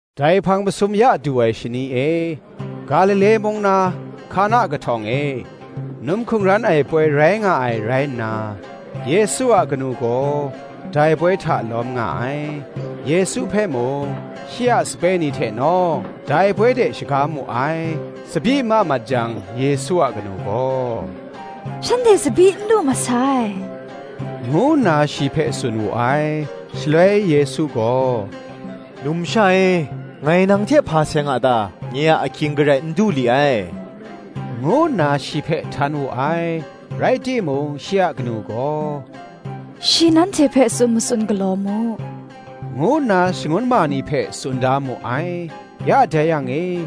Dai hpang masum ya du ai shani e, Galile mung na Hkana kahtawng e, num hkungran ai poi rai nga ai rai nna, Yesu a kanu gaw dai poi hta lawm nga ai: Yesu hpe mung, Shi a sape ni hte nawng, dai poi de shaga mu ai. Tsabyi ma mat jang Yesu a kanu gaw, “Shanhte tsabyi n lu masai,” ngu nna shi hpe tsun wu ai. Shaloi Yesu gaw, “Numsha e, ngai nang hte hpa seng a ta? nye a ahkying garai n du li ai,” ngu nna shi hpe htan wu ai. Rai timung shi a kanu gaw, “Shi nanhte hpe tsun matsun galaw mu,” ngu nna shangun ma ni hpe tsun da mu ai. Ya dai yang e,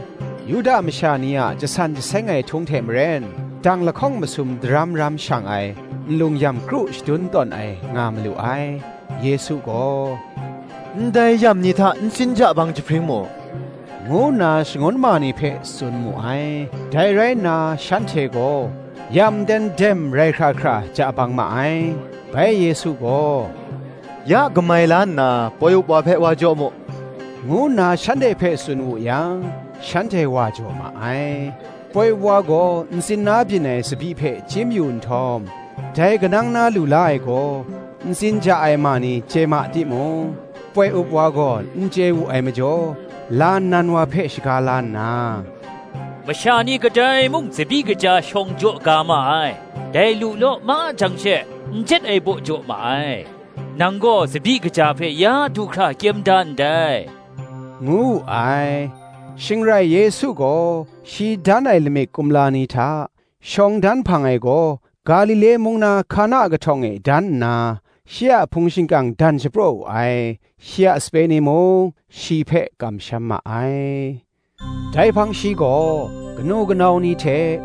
Yuda masha ni a jasan jaseng ai htung hte maren, dang lahkawng masum daram ram shang ai, nlung yam kru shadun tawn ai nga malu ai. Yesu gaw, “Ndai yam ni hta ntsin ja bang jahpring mu,” ngu nna shangun ma ni hpe tsun mu ai: dai rai nna shanhte gaw, yam nten dem rai hkra hkra ja bang ma ai. Bai Yesu gaw, “Ya kamai la nna poi up wa hpe wa jaw mu,” ngu nna shanhte hpe tsun wu yang, shanhte wa jaw ma ai. Poi up wa gaw ntsin na byin ai tsabyi hpe chyim yu nhtawm, dai kanang na lu la ai gaw, ntsin ja ai ma ni chye ma timung, poi up wa gaw n chye wu ai majaw, la nnan wa hpe shaga la nna, “Masha ni kadai mung tsabyi kaja shawng jaw ga ma ai; dai lu law ma jang she, n jet ai baw jaw ma ai: nang gaw tsabyi kaja hpe ya du hkra kyem da ndai,” ngu wu ai. Shing rai Yesu gaw shi dan ai lamik kumla ni hta, shawng dan hpang ai gaw, Galile mung na Hkana kahtawng e dan nna, shi a hpung shingkang dan shapraw wu ai: shi a sape ni mung, shi hpe kamsham ma ai. Dai hpang shi gaw, kanu, kanau ni hte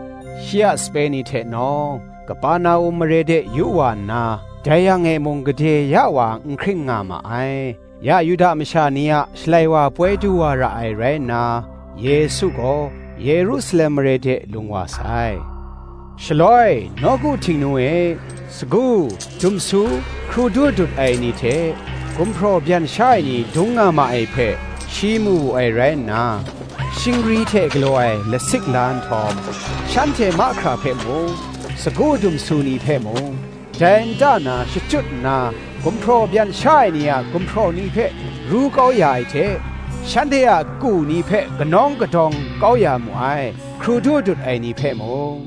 shi a sape ni hte nawng, Kaperna-um mare de yu wa nna, dai yang e mung, gade ya wa n hkring nga ma ai. Ya Yuda masha ni a Shalai wa ai poi du wa ra ai rai nna, Yesu gaw Yerusalem mare de lung wa sai. Shaloi nawku Htingnu e sagu, dumsu, hkrudu dut ai ni hte, gumhpraw byan sha ai ni dung nga ma ai hpe, shi mu wu ai rai nna, shingri hte galaw ai lasik la nhtawm, shanhte mahkra hpe mung, sagu dumsu ni hpe mung, dai nta na shachyut nna, gumhpraw byan sha ai ni a gumhpraw ni hpe ru kau ya ai hte, shanhte a ku ni hpe kanawng kadawng kau ya mu ai: hkrudu dut ai ni hpe mung,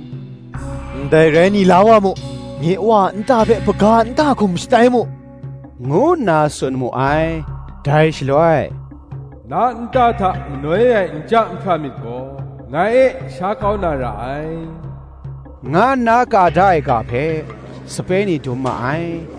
“Ndai rai ni la wa mu; nye Wa a nta hpe hpaga nta hkum shatai mu,” ngu nna tsun mu ai. Dai shaloi, “Na nta hta manoi ai nja nhpra myit gaw, ngai e sha kau na ra ai,” nga nna ka da ai ga hpe, sape ni dum ma ai.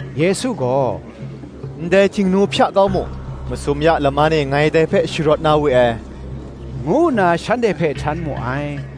Yesu gaw, “Ndai htingnu hpya kau mu; masum ya laman e ngai dai hpe sharawt na we ai,” ngu nna shanhte hpe htan mu ai.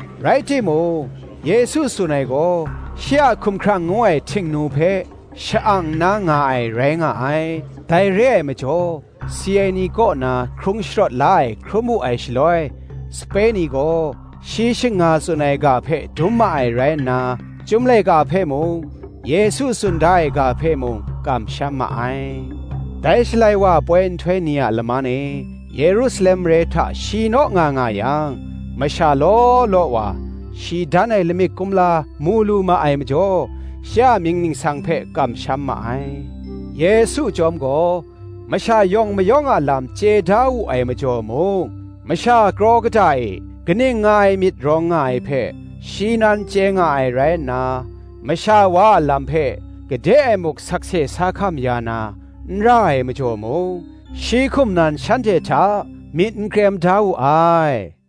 Rai timung, Yesu tsun ai gaw, shi a hkumhkrang ngu ai htingnu hpe, sha-ang nna nga ai, rai nga ai. Dai re ai majaw si ai ni kaw na hkrung sharawt la ai hkrum wu ai shaloi, sape ni gaw shi shing nga tsun ai ga hpe dum ma ai rai nna, Chyum laika hpe mung, Yesu tsun da ai ga hpe mung, kamsham ma ai. Dai Shalai wa ai poi nhtoi ni a laman e Yerusalem mare hta shi naw nga nga yang, masha law law wa, shi dan ai lamik kumla mu lu ma ai majaw, shi a mying ningsang hpe kamsham ma ai. Yesu chyawm gaw, masha yawng mayawng a lam chye da wu ai majaw mung, masha kraw kata e kaning nga ai myit rawng nga ai hpe, shi nan chye nga ai rai nna, masha wa a lam hpe gade e muk sakse sa hkam ya na, n ra ai majaw mung, shi hkum nan shanhte hta myit n krem da wu ai.